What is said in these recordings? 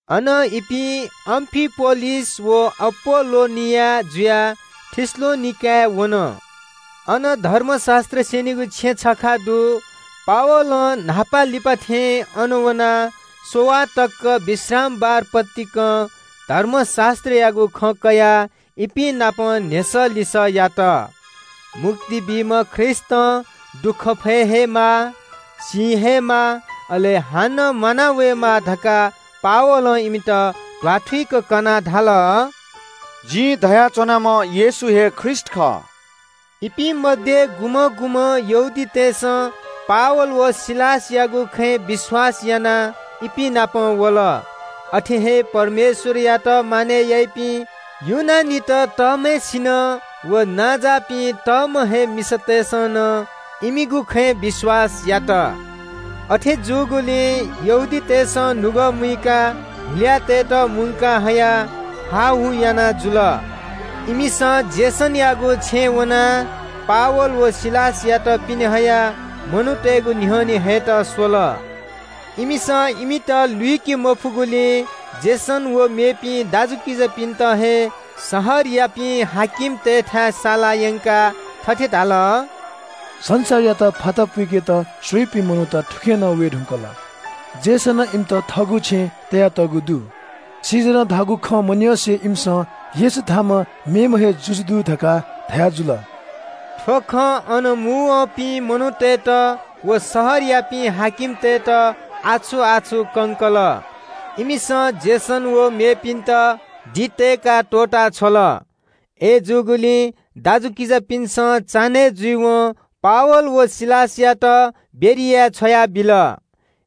अनं इपिं अम्‍फिपोलिस व अपोल्‍लोनिया जुयाः थेसलोनिके शहरय् वन। अन धर्मशास्‍त्र स्‍यनीगु छेँ छखा दु। पावलं न्‍हापालिपा थें अन वनाः स्‍ववाः तक विश्रामबार पतिकं धर्मशास्‍त्रयागु खँ कयाः इपिं नाप न्‍ह्यसः लिसः यात। मुक्ति बीम्‍ह ख्रीष्‍टं दुःख फये हे माः, सी हे माः, अले हानं म्‍वाना वयेमाः धकाः पावलं इमित ध्‍वाथुइक कनाः धाल – “जिं धया च्‍वनाम्‍ह येशू हे ख्रीष्‍ट खः।” इपिं मध्‍ये गुम्‍हं गुम्‍हं यहूदीतय्‌सं पावल व सिलासयागु खँय् विश्‍वास यानाः इपिं नाप वल। अथे हे परमेश्‍वरयात मानय् याइपिं ग्रीक तःम्‍हय्‌सिनं व नांजाःपिं तःम्‍ह हे मिसातय्‌सं नं इमिगु खँय् विश्‍वास यात। अथे जूगुलिं यहूदीतय् नायःतय्‌सं नुगः मुइकाः हुल्‍याःतय्‌त मुंका हयाः हाःहू याना जुल। इमिसं यासोनयागु छेँय् वनाः पावल व सिलासयात पिने हयाः मनूतय्‌गु न्‍ह्यःने हयेत स्‍वल। इमित लुइके मफुगुलिं यासोन व सुं मेपिं दाजुकिजापिन्‍त हे शहरयापिं हाकिमतय्‌थाय् साला यंकाः थथे धाल – “संसारयात फाता पुइकेत स्‍वइपिं मनूत थुखे नं वये धुंकल। यासोनं इमित थःगु छेँय् तयातःगु दु। कैसरं धाःगु खँ मन्‍यंसे इमिसं येशू धाःम्‍ह मेम्‍ह हे जुजु दु धकाः धयाजुल।” थ्‍व खं अन मुंवःपिं मनूतय्‌त व शहरयापिं हाकिमतय्‌त आछु-आछु कंकल। इमिसं यासोन व मेपिन्‍त दि तय्‌काः त्‍वःता छ्वल। अय्‌जूगुलिं दाजुकिजापिन्‍सं चान्‍हय् जुइवं पावल व सिलासयात बेरियाय् छ्वयाबिल।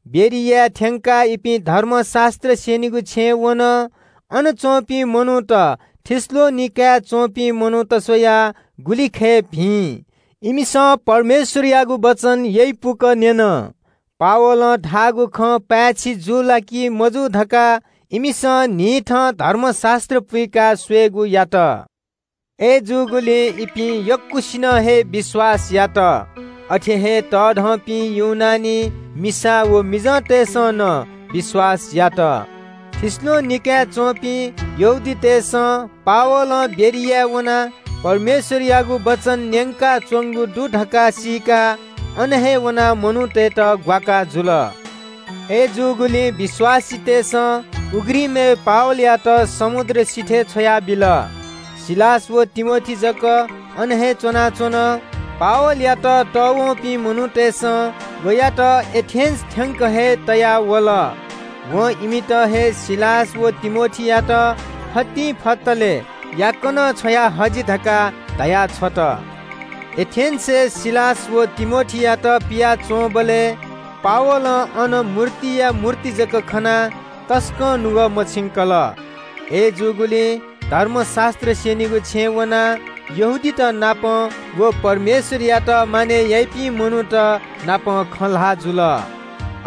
बेरियाय् थ्‍यंकाः इपिं धर्मशास्‍त्र स्‍यनीगु छेँय् वन। अन च्‍वंपिं मनूत थेसलोनिकेय् च्‍वंपिं मनूत स्‍वयाः गुलिखय् भिं। इमिसं परमेश्‍वरयागु वचन यइपुक न्‍यन। पावलं धाःगु खँ पाय्‌छि जू ला कि मजू धकाः इमिसं न्‍हिथं धर्मशास्‍त्र पुइकाः स्‍वयेगु यात। अय्‌जूगुलिं इपिं यक्‍वसिनं हे विश्‍वास यात। अथे हे तःधंपिं ग्रीक मिसा व मिजंतय्‌सं नं विश्‍वास यात। थेसलोनिकेय् च्‍वंपिं यहूदीतय् नायःतय्‌सं पावलं बेरियाय् वनाः परमेश्‍वरयागु वचन न्‍यंकाच्‍वंगु दु धकाः सीकाः अन नं मनूतय्‌त ग्‍वाकाः जुल। अय्‌जूगुलिं विश्‍वासीतय्‌सं उघ्रिमय् पावलयात समुद्र सिथय् छ्वयाबिल। सिलास व तिमोथी जक अन हे च्‍वनाच्‍वन। पावलयात तःवंपिं मनूतय्‌सं वयात एथेन्‍स थ्‍यंक हे तया वल। वं इमित हे सिलास व तिमोथीयात फतिंफतले याकनं छ्वया हजि धकाः धया छ्वल। एथेन्‍सय् सिलास व तिमोथीयात पियाच्‍वंबलय् पावलं अन मूर्तिया मूर्ति जक खनाः तसकं नुगः मछिंकल। अय्‌जूगुलिं धर्मशास्‍त्र स्‍यनीगु छेँय् वनाः यहूदीत नाप व परमेश्‍वरयात मानय् याइपिं मनूत नाप खँ ल्‍हाः जुल।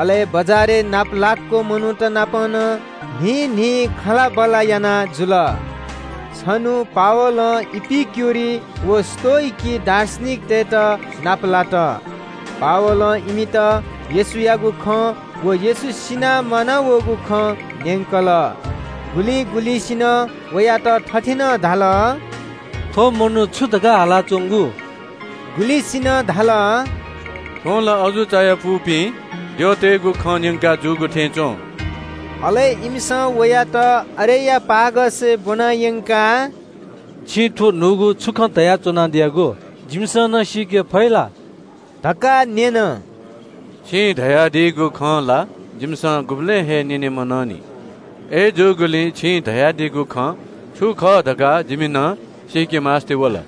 अले बजारय् नापलाक्‍व मनूत नाप नं न्‍हिं न्‍हिं खँल्‍हाबल्‍हा याना जुल। छन्‍हु पावलं इपिक्‍युरी व स्‍तोइकी दार्शनिकतय्‌त नापलात। पावलं इमित येशूयागु खँ व येशू सिनाः म्‍वानावःगु खँ न्‍यंकल। गुलिं गुलिंसिनं वयात थथे नं धाल – “थ्‍व मनू छु धकाः हालाच्‍वंगु?” गुलिसिनं धाल – “थ्‍वं ला अजू चायापुपिं द्यःतय्‌गु खँ न्‍यंकाजूगु थें च्‍वं।” अले इमिसं वयात अरियोपागसय् ब्‍वना यंकाः – “छिं थ्‍व न्‍हूगु छु खँ धया च्‍वनादियागु? जिमिसं नं सीके फइ ला?” धकाः न्‍यन। “छिं धयादीगु खँ ला जिमिसं गुबलें हे न्‍यने मनंनि। अय्‌जूगुलिं छिं धयादीगु खँ छु खः धकाः जिमि नं सीकेमास्‍ति वल।”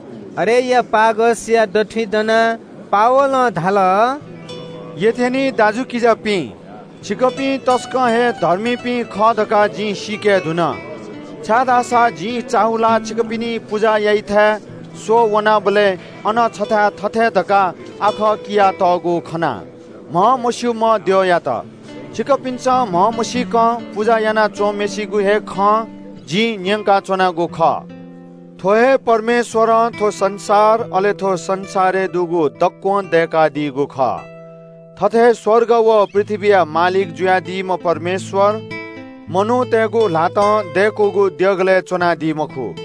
अरियोपागसया दथुइ दनाः पावलं धाल – “एथेन्‍सय् च्‍वंपिं दाजुकिजापिं, छिकपिं तसकं हे धर्मीपिं खः धकाः जिं सीके धुन। छाय्‌धाःसा जिं चाःहुलाः छिकपिनि पुजा याइथाय् स्‍वः वनाबलय् अन छथाय् थथे धकाः आखः कियातःगु खना – ‘म्‍हमस्‍यूम्‍ह द्यःयात।’ छिकपिन्‍सं म्‍हमसीकं पुजा याना च्‍वंम्‍हय्‌सिगु हे खँ जिं न्‍यंकाच्‍वनागु खः। “थ्‍व हे परमेश्‍वरं थ्‍व संसार, अले थ्‍व संसारय् दुगु दक्‍वं दय्‌कादीगु खः। थथे स्‍वर्ग व पृथ्‍वीया मालिक जुयादीम्‍ह परमेश्‍वर मनूतय्‌गु ल्‍हातं दय्‌कूगु देगलय् च्‍वनादी मखु।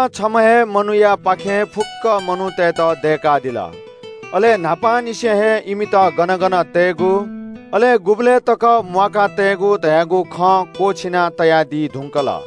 वय्‌कलं छम्‍ह हे मनूयापाखें फुक्‍क मनूतय्‌त दय्‌कादिल। अले न्‍हापांनिसें हे इमित गन गन तयेगु, अले गुबलय् तक म्‍वाका तयेगु धयागु खँ क्‍वःछिना तयादी धुंकल।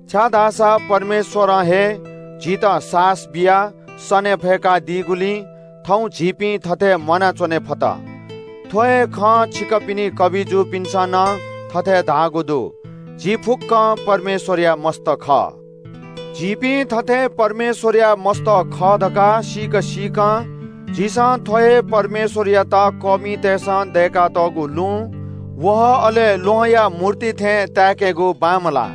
‘छाय्‌धाःसा परमेश्‍वरं हे झीत सासः बियाः सने फय्‌कादीगुलिं थौं झीपिं थथे म्‍वानाच्‍वने फत।’ थ्‍व हे खँ छिकपिनि कबिजुपिन्‍सं नं थथे धाःगु दु – ‘झी फुक्‍कं परमेश्‍वरया सन्‍तान खः।’ झीपिं थथे परमेश्‍वरया सन्‍तान खः धकाः सीक सीकं, झीसं थ्‍व हे परमेश्‍वरयात कःमितय्‌सं दय्‌कातःगु लुँ, वहः, अले ल्‍वहंया मूर्ति थें ताय्‌केगु बांमलाः।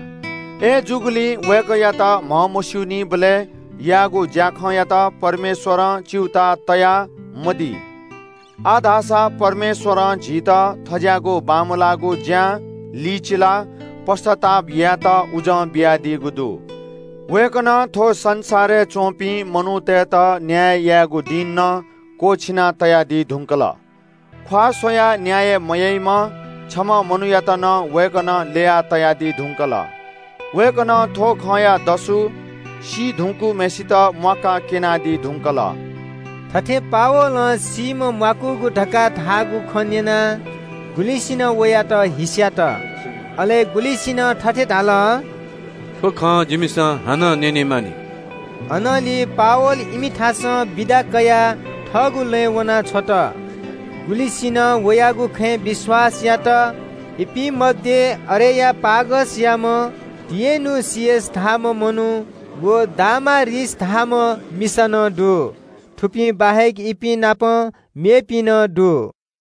“अय्‌जूगुलिं वय्‌कःयात म्‍हमस्‍यूनीबलय् याःगु ज्‍याखँयात परमेश्‍वरं च्‍यूताः तयामदी। आः धाःसा परमेश्‍वरं झीत थज्‍याःगु बांमलाःगु ज्‍यां लिचिलाः पश्‍चाताप यायेत उजं बियादीगु दु। वय्‌कलं थ्‍व संसारय् च्‍वंपिं मनूतय्‌त न्‍याय यायेगु दिं नं क्‍वःछिना तयादी धुंकल। ख्‍वाः स्‍वयाः न्‍याय मयाइम्‍ह छम्‍ह मनूयात नं वय्‌कलं ल्‍यया तयादी धुंकल। वय्‌कलं थ्‍व खँया दसु सी धुंकूम्‍हय्‌सित म्‍वाकाः क्‍यनादी धुंकल।” थथे पावलं सीम्‍ह म्‍वाकूगु धकाः धाःगु खँ न्‍यनाः गुलिसिनं वयात हिस्‍यात, अले गुलिसिनं थथे धाल – “थ्‍व खँ जिमिसं हानं न्‍यने मानि।” अनंलि पावल इमिथासं बिदा कयाः थःगु लँय् वना छ्वल। गुलिसिनं वयागु खँय् विश्‍वास यात। इपिं मध्‍ये अरियोपागसयाम्‍ह दुजः डियनुसियस धाःम्‍ह मनू व दामारिस धाःम्‍ह मिसा नं दु। थुपिं बाहेक इपिं नाप मेपिं नं दु।